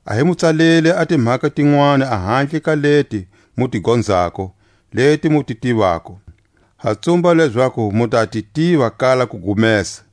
A hi mu tsaleli a timhaka tinwani ahandle ka leti mu ti gonzako, leti mu ti tivako; ha tsumba lezaku mu ta ti tiva kala kugumesa,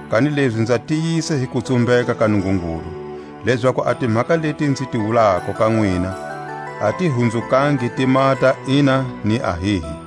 Kanilezi nza tiyisa hi kutsumbeka ka Nungungulu, lezaku a timhaka leti nzi ti wulako ka nwina a ti hunzukangi ti maha ta Ina ni Ahihi.